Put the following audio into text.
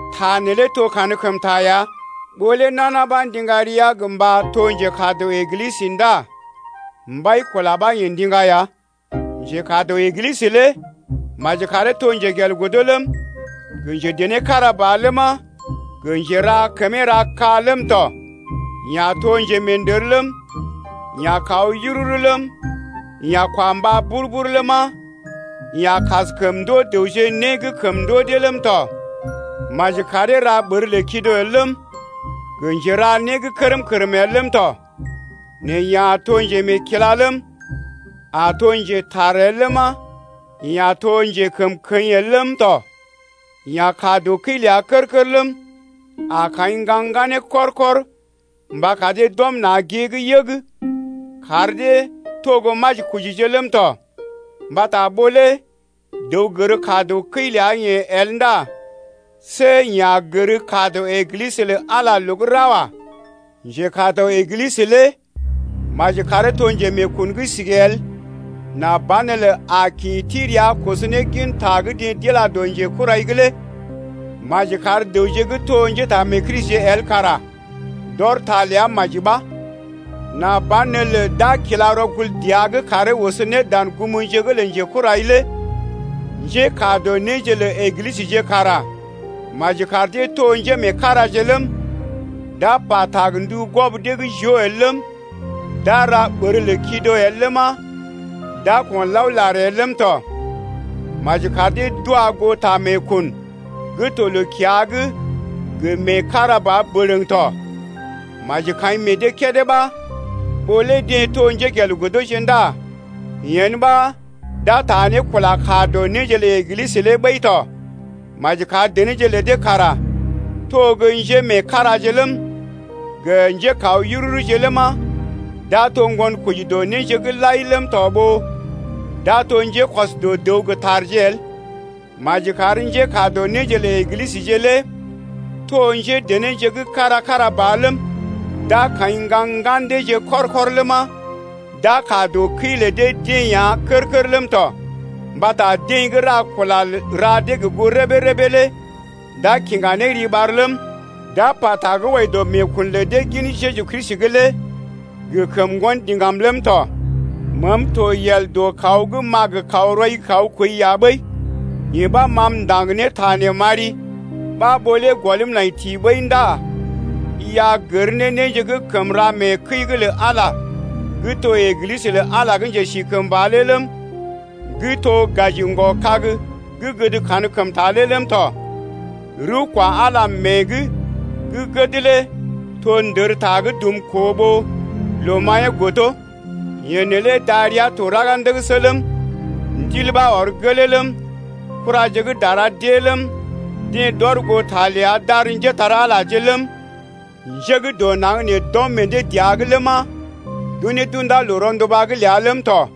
Ta neelé to kankəmta ya: ɓó lé nana ɓa ndiŋga rəa gə mba to njekaa dɔ Eglisə ndá mbai-kula ɓa yeḛ ndiŋga ya. Njekaa dɔ Eglisə lé maji karee to njegelgodo ləm, gə njedené kára ba ləma, gə njera kəmee rakaa ləm tɔ, yeḛ a to njemeendər ləm, yeḛ a kaw yururu ləm, yeḛ a kwa mbá bur-bur ləma, yeḛ a kaskəm ndoo dəwje né gə́ kəm ndoo dee ləm tɔ. Maji karee to gə́ ɓər lə kido el ləm, gə njera né kərm-kərm el ləm tɔ. Nɛ yeḛ a to njemeekila ləm, a to njetar el ləma, yeḛ a to njekəmkəḭ el ləm tɔ. Yeḛ a kaa dɔ kəi ləa kər-kər ləm, a kaḭ ŋgaŋ ŋganee kɔr-kɔr mba kar dee d’ɔm na̰ gée’g yəg kar dee to gə́ majikojije ləm tɔ. Mbata ɓó lé dəw gər kaa dɔ kəi ləa-yeḛ el ndá see yeḛ a gər kaa dɔ Eglisə lə Ala loo gə́ ra gə́ wa. Njekaa dɔ Eglisə lé maji karee to njemeekun gə́ sigi el nà banelə a kḭ ti rəa koso ne gin ta gə́ deḛ d’ila dɔ njekurai’g lé. Maji kar dəwje gə́ to njétaamee-Kristije el kara d’ɔr ta ləa maji ɓa, nà banelə d’a kila rɔkul dəa’g karee oso ne dan gumje’g lə njekurai lé. Njékaa dɔ néje lə Eglisəje kara maji kar dee to njémeekaraje ləm, d’a pata gə ndu gwɔb dee gə́ joo el ləm, d’a ra ɓər lə kido el ləma, d’a ko̰laolar el ləm tɔ. Maji kar dee d’wa goo ta meekun gə́ to loo-kiya’g gə mee kára ba bərəŋ tɔ. Maji kaḭ meḛ dee kédé ɓa, ɓó lé deḛ to gə́ njégelgodoje ndá yen ɓa, d’a taa ne kula kaa dɔ néje lə Eglisə lé ɓəi tɔ. Maji kar denéje lə dee kara to gə́ njémeekaraje ləm, gə njékaw yururuje ləma, d’a to ŋgonkoji dɔ néje’g lai ləm tɔ ɓó d’a to njékɔs dɔ dəw gə tarje el. Maji kar njékaa dɔ néje lə Eglisəje lé to njédenéje gə́ kára-kára ba ləm, d’a kaḭ ŋgaŋ ŋgan deeje kɔr-kɔr ləma, d’a kaa dɔ kəi lə dee-deḛ ya kər-kər ləm tɔ. Mbata deḛ gə́ ra kula ra dee gə goo rəbee-rəbee lé d’a kiŋga ne riɓar ləm, d’a pata gə́ wɔji dɔ meekun lə dee gin Jeju Kristi’g lé gə kəm ŋgon diŋgam ləm tɔ. Meem to yel dɔ kaw gə́ m’a gə kaw rɔi’g kaw kooi ya ɓəi, yee ɓa ma m’ndaŋg ne ta nee m’ari ɓa ɓó lé gɔlm nai ti ɓəi ndá i a gər ne néje gə́ kəm ra mee kəi’g lə Ala gə́ to Eglisə lə Ala gə́ njesikəmba lé ləm, gə́ to gaji ŋgɔ-kag gə́ gəd kankəmta lé ləm tɔ. Rəw kwa Ala mée’g gə́ gəd lé to ndərta gə́ dumkoo ɓó loo-maḭyee godo. Yeḛ neelé darəa to raga ndəgəsə ləm, Ndil ɓa ɔr gelee ləm, Kuraje gə́ dara d’ée ləm, Deḛ d’ɔr goo ta ləa d’ar njépole-magəje ləm, Nje gə́ dɔ naŋg nee d’ɔm meḛ dee dəa’g ləm d’unee d’unda loo ronduba’g ləa ləm tɔ.